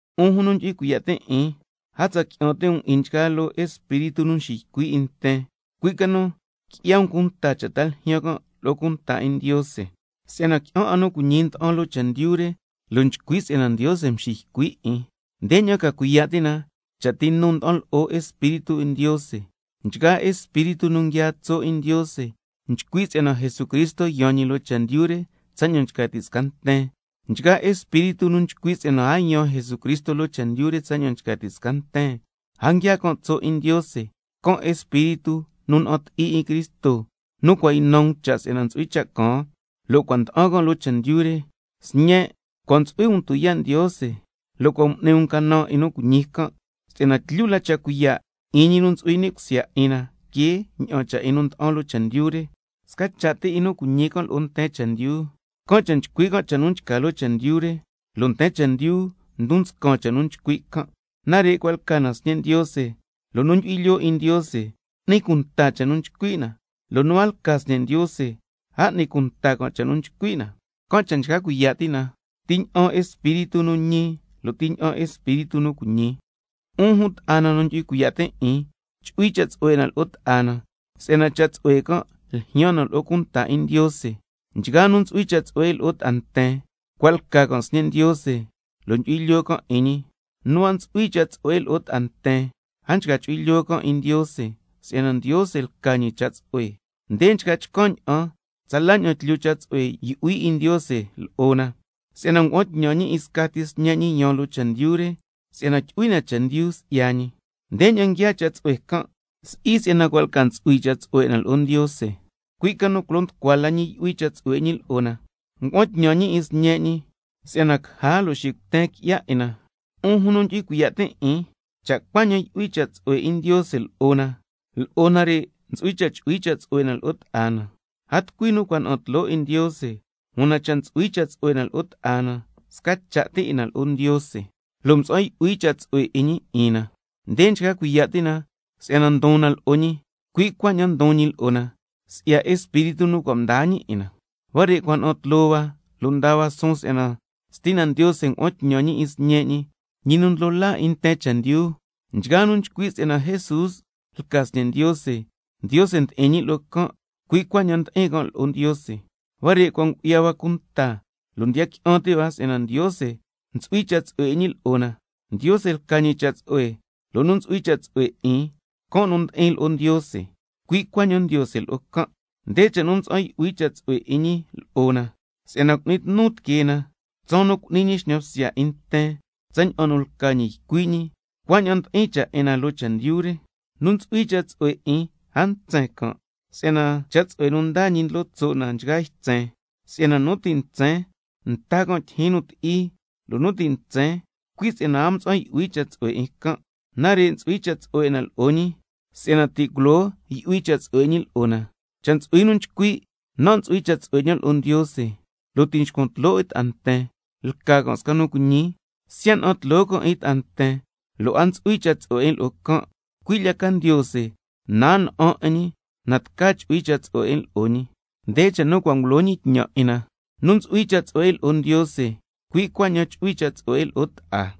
'Un jun nu ndyu'hui cuiya' tin' 'in, a tsa qui'an ti' um 'in nchgaa loo espíritu nu nxiycui' 'in nten, cui' ca nu qui'ya um cunta cha' ta ljyaan can' lo'o cunta 'in Ndiose, si'yana qui'an 'a nu cuiñi nda'an loo chendyu re, lo' nchcui' si'yana Ndiose nxiycui' 'in. Ndeña'an ca cuiya' ti' na cha' ti nu nda'an lo'o Espíritu 'in Ndiose: Nchgaa espíritu nu nguiaa tso' 'in Ndiose nchcui' si'yana Jesucristo yaan ñi loo chendyu re tsaña'an nchca ti' sca nten. Nchgaa espíritu nu nchcui' si'yana a yaan Jesucristo loo chendyu re tsaña'an nchca ti' sca nten, a nguiaa can' tso' 'in Ndiose, can' espíritu nu na'an ti'i 'in Cristo, nu cua' ynan um cha' si'yana ntsu'hui cha' caan, lo' cua' nda'an can' loo chendyu re. Sñen', cua' ntsu'hui um tuyaa' Ndiose, lo' cua' m'ni um canan 'in nu cuiñi can', si'yana tlyu la cha' cuiya' 'in ñi nu ntsu'hui ni' cusya 'in na que ña'an cha' 'in nu nda'an loo chendyu re. Sca cha' ti 'in nu cuiñi can' lo'o nten chendyu, can' cha' nchcui' can' cha' nu nchca loo chendyu re, lo' nten chendyu ndon nscan cha' nu nchcui' can'. Nare' cua' lca na sñe' Ndiose, lo' nu ndyu'hui lyoo 'in Ndiose n'ni cunta cha' nu nchcui' na, lo' nu a lca sñe' Ndiose a n'ni cunta cha' nu nchcui' na. Can' cha' nchca cuiya' ti' na ti ña'an espíritu nu ñi lo' ti ña'an espíritu nu cuiñi. 'Un jun nu ndyu'hui cuiya' tin' 'in, chu'hui cha' tsu'hue 'in na lo'o ta'a na, si'yana cha' tsu'hue can' ljyaan na lo'o cunta 'in Ndiose. Nchgaa nu ntsu'hui cha' tsu'hue 'in lo'o ta'a nten, cua' lca can' sñe' Ndiose, lo' ndyu'hui lyoo can' 'in ñi. Nu a ntsu'hui cha' tsu'hue 'in lo'o ta'a nten, a nchca chu'hui lyoo can' 'in Ndiose, si'yana Ndiose lca ñi cha' tsu'hue. Nde nchca chcan' ña'an tsala ña'an tlyu cha' tsu'hue yu'hui 'in Ndiose lo'o na, si'yana ngua'an tñan ñi 'in scati Sñe' ñi yaan loo chendyu re, si'yana tyu'hui na chendyu si'ya ñi. Ndeña'an nguiaa cha' tsu'hue can': Si'i si'yana cua' lca ntsu'hui cha' tsu'hue 'in na lo'o Ndiose, cui' ca nu culo nducua la ñi yu'hui cha' tsu'hue 'in ñi lo'o na, ngua'an tñan ñi 'in Sñe' ñi, si'yana caja lo' xicuten qui'ya 'in na. 'Un jun nu ndyu'hui cuiya' tin' 'in, cha' Ndiose cuaña'an yu'hui cha' tsu'hue 'in ñi lo'o na, lo'o nare' ntsu'hui cha' chu'hui cha' tsu'hue 'in na lo'o ta'a na. A tucui nu cua' na'an tloo 'in Ndiose, una cha' ntsu'hui cha' tsu'hue 'in na lo'o ta'a na, sca cha' ti 'in na lo'o Ndiose, lo' mtsa'an yu'hui cha' tsu'hue 'in ñi ni' cusya 'in na. Nde nchca cuiya' ti' na si'yana ndon na lo'o ñi, cui' cuaña'an ndon ñi lo'o na, si'ya Espíritu nu cua' mdaa ñi 'in na. Huare' cua' na'an hua lo' ndaa hua suun si'yana Stina Ndiose ngua'an tñan ñi 'in Sñe' ñi, ñi nu ndlo laa 'in nten chendyu. Nchgaa nu nchcui' si'yana Jesús lca ñi Sñe' Ndiose, Ndiose ndi'in ñi lo'o can', cui' cuaña'an ndi'in can' lo'o Ndiose. Huare' cua' ngu'ya hua cunta lo' ndiya qui'an ti' hua si'yana Ndiose ntsu'hui cha' tsu'hue 'in ñi lo'o na. Ndiose lca ñi cha' tsu'hue, lo' nu ntsu'hui cha' tsu'hue 'in, can' nu ndi'in lo'o Ndiose, cui' cuaña'an Ndiose lo'o can'. Nde cha' nu mtsa'an yu'hui cha' tsu'hue 'in ñi lo'o na, si'yana cu'ni tnu tiquee na tsaan nu cu'ni ñi xñan bsya 'in nten. Tsaña'an nu lca ñi ycui' ñi, cuaña'an ndi'in cha' 'in na loo chendyu re. Nu ntsu'hui cha' tsu'hue 'in a ntsen can', si'yana cha' tsu'hue nu ndaa ñi ndlo tso' na nchgaa ytsen, si'yana nu ti' ntsen nta can' tyijyin nu ti'i. Lo' nu ti' ntsen, cui' si'yana a mtsa'an yu'hui lo'o cha' tsu'hue can'. Nare' ntsu'hui cha' tsu'hue 'in na lo'o ñi, si'yana ti' culoo yu'hui cha' tsu'hue 'in ñi lo'o na. Cha' ntsu'hui nu nchcui': Nan' ntsu'hui cha' tsu'hue 'ñan lo'o Ndiose, lo' ti' nxcuan tloo 'in ta'a nten, lca can' sca nu cuiñi. Siya' na'an tloo can' 'in ta'a nten, lo' a ntsu'hui cha' tsu'hue 'in lo'o can', cui' lya ca Ndiose, na a na'an 'in ñi, na tca chu'hui cha' tsu'hue 'in lo'o ñi. Nde cha' nu cua' ngulo ñi tñan 'in na: Nu ntsu'hui cha' tsu'hue 'in lo'o Ndiose, cui' cuaña'an chu'hui cha' tsu'hue 'in lo'o ta'a.